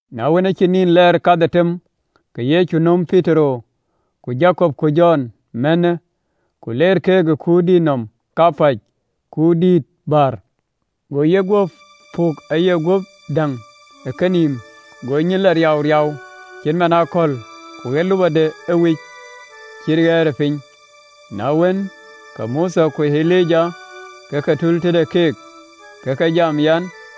Na wën, aacï nïn lɛɛr kadhetem, ke Yecu nöm Petero, ku Jakop, ku Jɔn mänhë, ku leer keek ë kuurdït nɔm kapäc, kuurdïït bäär, go yeguöp puk aye guöp däŋ ë kenïïm, go nyin lɔ riauriau cït man ë akɔ̈l, ku ɣer lupɔde ëwic cït ɣɛɛrëpiny. Na wën, ke Mothe ku Elija ë ke tul tëde keek, ke ke jam ë yen.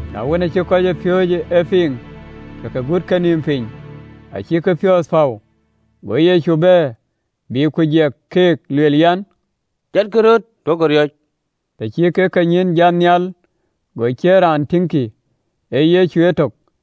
Na wën, aacï kɔcpiööcë e piŋ, ke ke gut kenïïm piny, acïk piɔ̈ɔ̈th päu. Go Yecu bɛ̈n, bï ku jiɛk keek, lueel an, “Jatkï röt, duökï riɔ̈c!” Të cï kek kenyïïn jat nhial, go ciën raan tïŋkï, ee Yecu etök.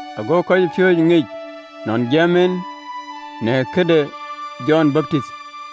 Ago kɔcpiööcë ŋic nɔn jiɛɛm en në këde Jɔn Baptith.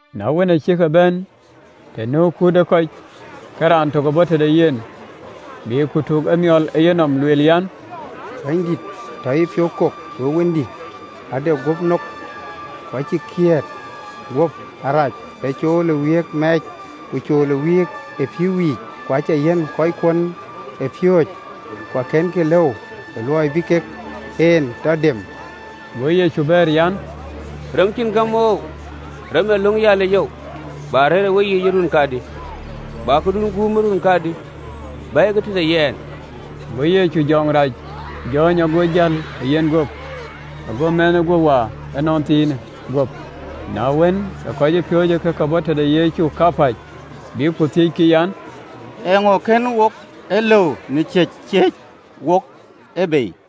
Na wën, aa cïk bɛ̈n të nu kut ë kɔc, ke raan tök bɔ̈ tëde yen, bï ku tuk emiɔl ë yenɔm, lueel an, “Bɛ̈nydït, tɔ yïpiɔ̈u kok we wëndï, ade guöp nok, ku acï kiët guöp arac, ee cool ë wïïk mɛɛc, ku cool ë wïïk ë pïïu yiic. Ku acä yiɛ̈n kɔckuön ë piööcë, ku akënkï lëu ë luɔi bï kek en tɔ dem.” Go Yecu bɛ̈ɛ̈r an, “Rem cïn gäm oou, rem ë löŋ yalic oou! Bä rëër ë weyiic ë run kadï? Bä kakun guum ë run kadï? Bɛ̈ɛ̈ikï tëde yɛn!” Go Yecu jɔŋ rac jɔ̈ɔ̈ny, go jäl ë yeguöp, go meth guöp waar ënɔnthiinë guöp. Na wën, ke kɔcpiööcë ë ke bɔ̈ tëde Yecu kapäc, bïk ku thiëckï an, “Eeŋö kën wok e lëu në ciëc ciëëc wok e bei?”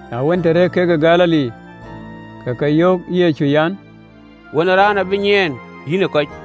Na wën, të rëër kek ë Galili, ke ke yöök ë Yecu, an, “Wën ë Raan abï nyiɛɛn yïnë kɔc,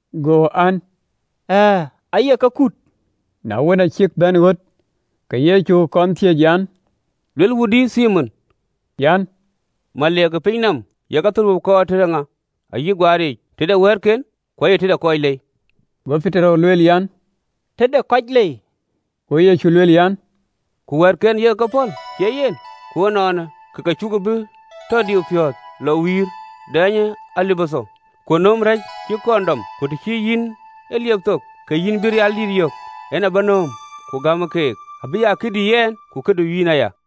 Go, an, “Ɣɛɛ, aye ke kut.” Na wën, aacï bɛ̈n ɣöt ke Yecu kɔn thiëëc an, “Ye luel wudï, Thimon? Ee yïŋa ee meliik ke pinynɔm kuöt athölbö ayï guaaric? Ee kɔcken, ku ye alɛi tei?” Go Petero bɛ̈ɛ̈r an, “Ee alɛi.” Go Yecu puk nɔm an, “Ku kɔcken acïkï ee kut, cie yen? Ku ënɔɔnë, ke ke cuku bï tɔ diu piɔ̈ɔ̈th, lɔ wïïr, dɛɛnyë alabithɔ, ku nöm rɛ̈c cï kɔn dɔm, ku të cï yïn e liep thok, ke yïn bï rialdït yök. Nöm, ku gämë keek, abï aa këdï yɛn ku këdu yïn aya.”